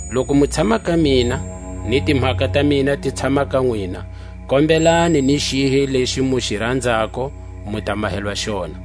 Loku mu tshama ka mina, ni timhaka ta mina ti tshama ka nwina, kombelani ni xihi lexi mu xi ranzako, mu ta mahelwa xona.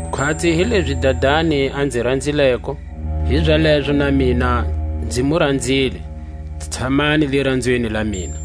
Khwatsi hilezi Dadani a nzi ranzileko, hizalezo na mina nzi mu ranzile; tshamani liranzweni la mina.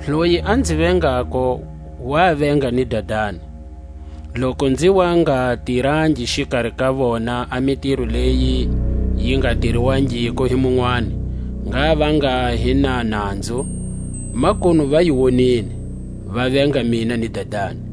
Loyi a nzi vengako wa venga ni Dadani. Loku nzi wa nga tirangi xikari ka vona a mitiro leyi yi nga tiriwangiko hi munwani, ngha va nga hi na nanzu; makunu va yi wonile, va venga mina ni Dadani.